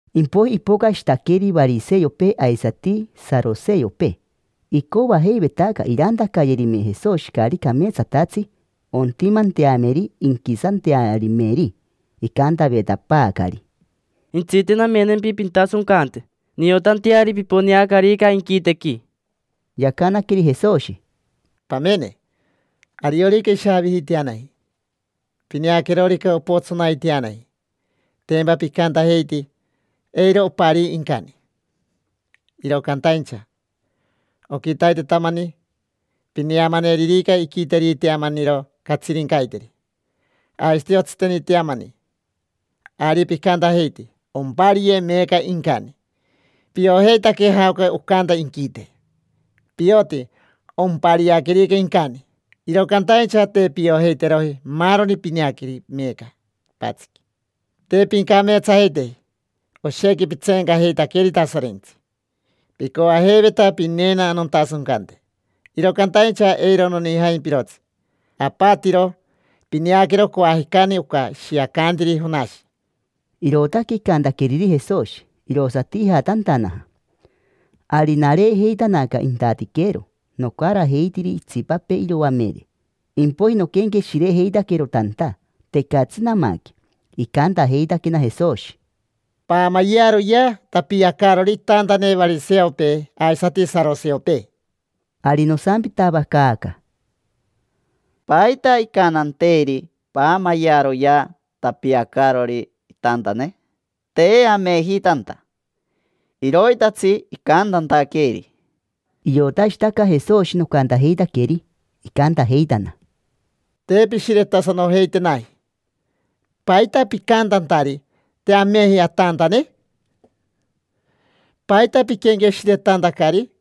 Impoiji ipocashitaqueri variseopee aisati saroseopee: icoajeivetaca irantacayerime Jesoshi caari cameetsatatsi ontimanteameri inquisantearimeri. Icantavetapaacari: —Jentsite, namenempi pintasoncante, niotanteari piponeacarica inquitequi. Yacanaqueri Jesoshi: —Pamene, ariorica ishaavijiiteanaji, pineaquerorica opotsonaiteanaji, tempa picantajeiti: “Eiro oparii incani”. Iro cantaincha, oquitaitetamani, pineamaneririca iquiteriteamaniro catsirincaiteri, aisati otsiteniiteamani, ari picantajeiti: “Ompariye meeca incani”. Piojeitaque jaoca ocanta inquite, pioti ompariaquerica incani. Iro cantaincha te piojeiteroji maaroni pineaqueri meeca quipatsiqui. Te pincameetsajeiteji, oshequi pitseencajeitaqueri Tasorentsi: picoajeiveta pineena nontasoncante, iro cantaincha eiro nonijaimpirotsi. Apatiro pineaquero coajicani oca ishiacantiri Jonashi. Irootaque icantaqueriri Jesoshi, irosati ijatantanaja. Ari nareejeitanaca intatiquero, nocarajeitiri itsipapee iroamere. Impoiji noquenqueshirejeitaquero tanta: tecatsi namaque. Icantajeitaquena Jesoshi: —Paamayearoyea tapiacaarori itantane variseopee aisati saroseopee. Ari nosampitavacaaca: —¿Paita icantanteeri: “Paamayearoyea tapiacaarori itantane”? Te ameji tanta, iroitatsi icantantaqueeri. Iotashitaca Jesoshi nocantajeitaqueri, icantajeitana: —Te pishiretasanojeitenaji. ¿Paita picantantari: “Te ameji atantane”? ¿Paita piquenqueshiretantacari?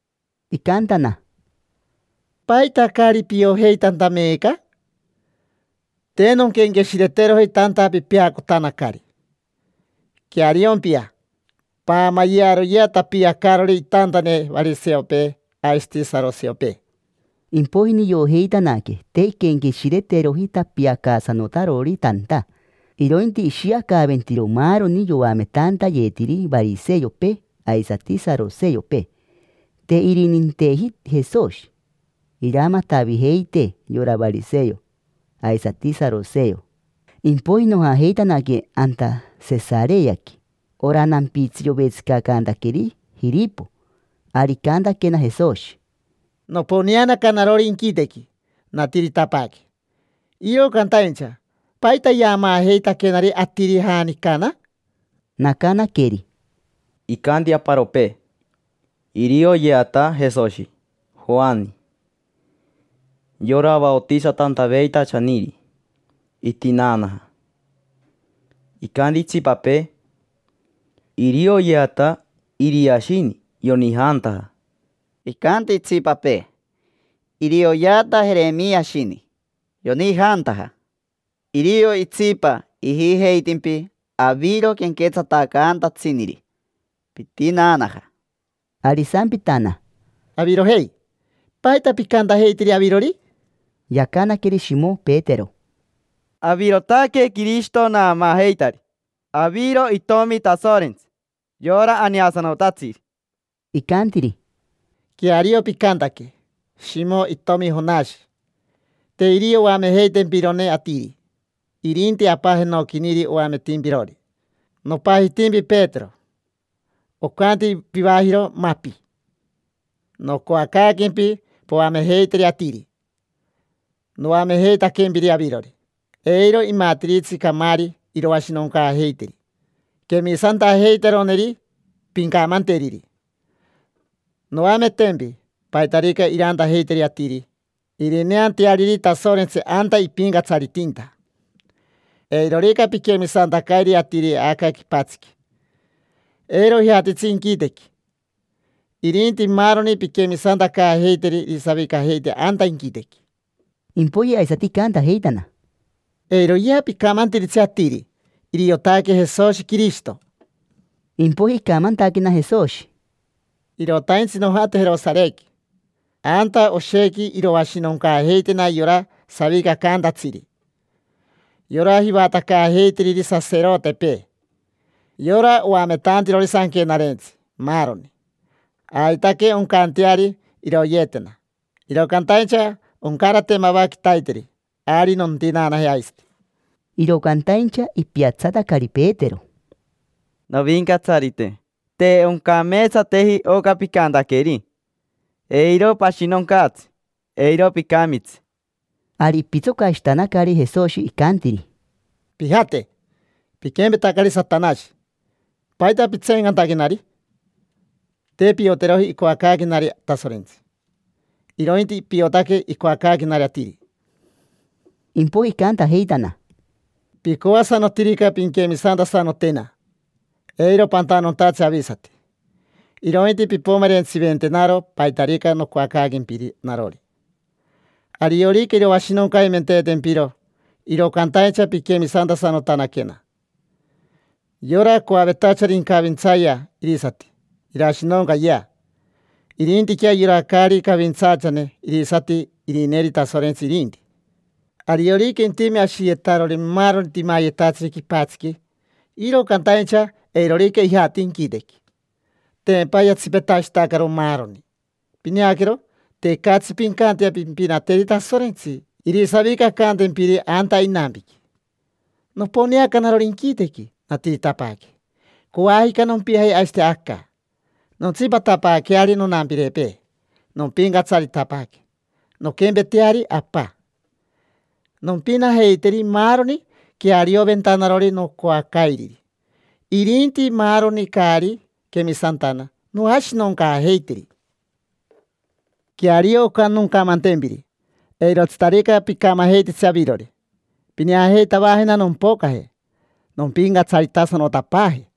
Icantana: —¿Paita caari piojeitanta meeca? Te nonquenqueshireteroji tanta pipeacotanacari. Queariompia, paamayearoyea tapiacaarori itantane variseopee aisati saroseopee. Impoiji niojeitanaque te inquenqueshireteroji tapiacaasanotarori tanta, irointi ishiacaventiro maaroni yoametantayetiri variseopee aisati saroseopee. Te irininteji Jesoshi iramatavijeitee yora variseo aisati saroseo. Impoiji nojajeitanaque anta Sesareaqui: ora nampitsi yovetsicacantaqueri Jiripo. Ari icantaquena Jesoshi: —Noponeanaca narori inquitequi, natiritapaaque, iro cantaincha ¿paita yaamaajeitaquenari atiri, janicana? Nacanaqueri: —Icanti aparopee: “Irioyeata Jesoshi Joani, yora vaotisatantaveitachaniri, itinaanaja”. Icanti itsipapee: “Irioyeata Iriashini, yonijantaja”. Icanti itsipapee: “Irioyeata Jerimiashini, yonijantaja”. Irio itsipa ijijeitimpi aviro quenquetsatacantatsiniri, pitinaanaja. Ari isampitana: —Avirojei, ¿paita picantajeitiri avirori? Yacanaqueri Shimo Petero: —Avirotaque Quirishito naamaajeitari. Aviro Itomi Tasorentsi, yora Aneasanotatsiri. Icantiri: —Queario picantaque, Shimo itomi Jonashi. Te irio oamejeitempirone atiri, irinti Apa jenoquiniri oametimpirori. Nopajitimpi Petero: ocanti pivajiro “Mapi”. Nocoacaaquempi poamejeiteri atiri noamejeitaquempiri avirori. Eiro imatiritsi camaari iroashinoncaajeiteri quemisantajeiteroneri pincamanteriri. Noametempi paitarica irantajeiteri atiri irineanteariri Tasorentsi anta ipincatsaritinta. Eirorica piquemisantacairi atiri aca quipatsiqui, eiro ijatitsi inquitequi; irinti maaroni pinquemisantacaajeiteri irisavicajeite anta inquitequi. Impoiji aisati icantajeitana: —Eiroyea picamantiritsi atiri: “Iriotaque Jesoshi Quirishito”. Impoiji icamantaquena Jesoshi: —Irotaintsi nojate Jerosarequi. Anta oshequi iroashinoncaajeitena yora savicacantatsiri, yora jivatacaajeitiriri saserotepee, yora oametantirori Sanquenarentsi, maaroni. Aitaque oncanteari iroyeetena, iro cantaincha oncarate mava quitaiteri, ari nontinaanaje aisati. Iro cantaincha ipiatsatacari Petero: —Novincatsarite, te oncameetsateji oca picantaqueri. Eiro pashinoncaatsi, eiro picamitsi. Ari ipitsocashitanacari Jesoshi, icantiri: —Pijate, piquempetacari Satanashi. ¿Paita pitseencantaquenari? Te pioteroji icoacaaquenari Tasorentsi, irointi piotaque icoacaaquenari atiri. Impoiji icantajeitana: —Picoasanotirica pinquemisantasanotena, eiro pantanontatsi avisati, irointi pimpomerentsiventenaro paitarica noncoacaaquempiri narori. Ariorica iroashinoncaimenteetempiro, iro cantaincha pinquemisantasanotanaquena. Yora coavetachari incavintsayea irisati irashinoncayea; irintiquea yora caari cavintsaachane irisati irineeri Tasorentsi irinti. Ariorica intime ashiyetarori maaroni timayetatsiri quipatsiqui, iro cantaincha eirorica ijati inquitequi, tempa yatsipetashitacaro maaroni. Pineaquero, tecatsi pincantea pimpinateri Tasorentsi irisavicacantempiri anta inampiqui. Noponeaca narori inquitequi, natiritapaaque. Coajica nompiaje aisati aca, nontsipatapaaqueari nonampirepee, nompincatsaritapaaque, nonquempeteari Apa. Nompinajeiteri maaroni quearioventanarori nocoacairiri. Irinti maaroni caari quemisantana, noashinoncaajeiteri. Queario oca noncamantempiri: eirotsitarica picamajeititsi avirori, pineajeitavajena nompocaje, nompincatsaritasanotapaaje.